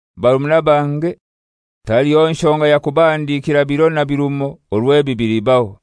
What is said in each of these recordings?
Barumuna bange, taliho nshonga ya kubahandikira biro na birumo orwo ebi bilibaho.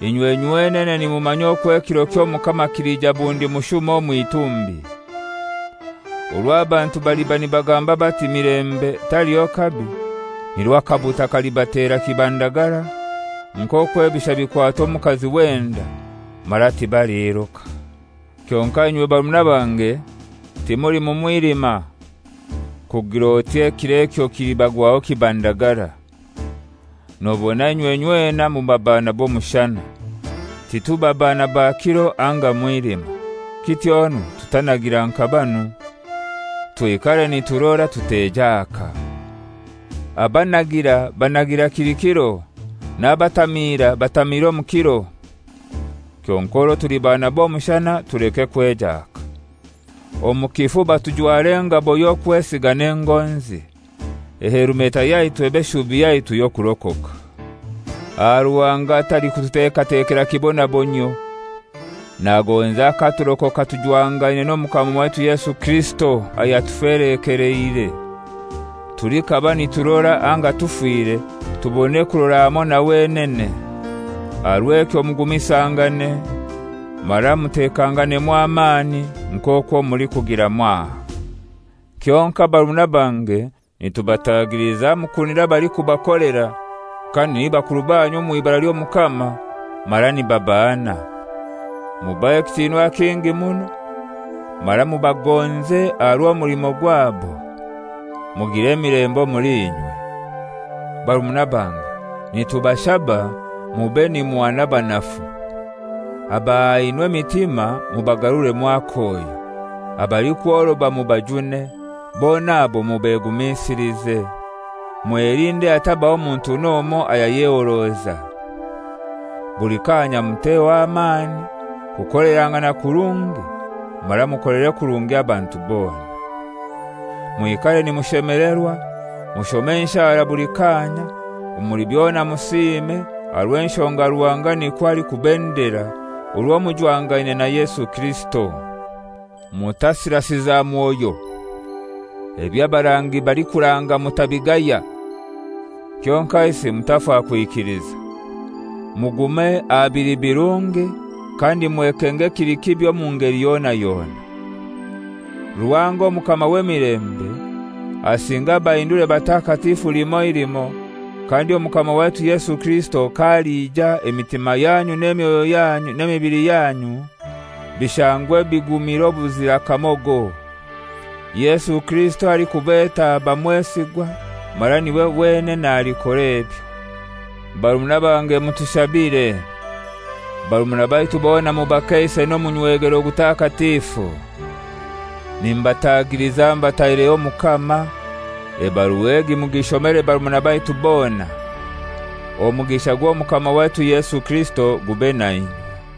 Inywe nywenene nimumanya okwo ekiro ky'Omukama kilija bundi mushuma omw'itumbi. Orwo abantu baliba nibagamba bati, «Milembe, taliho kabi,» nirwo akabuta kalibatera kibandagara nk'okwo ebisha bikwata omukazi w'enda, mara tibaliiruka. Kyonkai inywe barumuna bange, timuli mu mwilima, kugir'oti ekiro ekyo kilibagwaho kibandagara. Nobona inywe inywena muba bana b'omushana. Tituba bana ba kiro anga mwilima. Kityonu tutanagira nka banu. Twikare niturora, tutejaaka. Abanagira banagira kili kiro, n'abatamiira batamiira omu kiro. Kyonkai orwo tuli bana b'omushana tuleke kwejaaka. Omu kifuba tujware engabo y'okwesiga n'engonzi. Ehelumeta yaitu ebe shubi yaitu y'okurokoka. Aha Ruhanga talikututekatekera kibonabonyio. Nagonza katurokoka tujwangaine n'Omukama waitu Yesu Kirisito, ayatufelekeleire: Tulikaba niturora anga tufire tubone kurora hamoi na wenene. Aha rw'ekyo mugumisangane mara mutekanganemu amani, nk'okwo mulikugira mwaha. Kyonkai barumuna bange, nitubatagiliza mukunire abalikubakolera, kandi ni bakuru banyu omw'ibara ly'Omukama, mara nibabahana. Mubahe ekitinwa kingi muno mara mubagonze aha rw'omulimo gwabo. Mugire emilembe omuli inywe. Barumuna bange, nitubashaba mube nimuhana abanafu; abahahaine emitima mubagaruremu akoyo, abalikworoba mubajune, bona abo mubegumisilize. Mwelinde hatabaho muntu n'omoi ayayehoroza. Buli kanya muteho amani kukolerangana kurungi mara mukolere kurungi abantu bona. Mwikare nimushemelerwa, mushome enshara buli kaanya, omuli byona musiime, aha rw'enshonga Ruhanga nikwo alikubendera orwo mujwangaine na Yesu Kirisito. Mutasirasiza Mwoyo. Eby'abarangi balikuranga mutabigaya, kyonkaisi mutafa kwikiliza. Mugume aha bili birungi, kandi mwekenge ekili kibi omu ngeli yona yona. Ruhanga Omukama w'emilembe asinge abahindure batakatifu limoi limoi, kandi Omukama waitu Yesu Kirisito k'alija emitima yanyu n'emyoyo yanyu n'emibili yanyu bishangwe bigumire obuzira kamogo. Yesu Kirisito alikubeta aba mwesigwa, mara niwe wenene alikora ebyo. Barumuna bange mutushabire. Barumuna baitu bona mubakeise n'omunywegero gutakatifu. Nimbatagiliza mbataireho Omukama, ebarua egi mugishomere barumuna baitu bona. Omugisha gw'Omukama waitu Yesu Kirisito gube nainywe.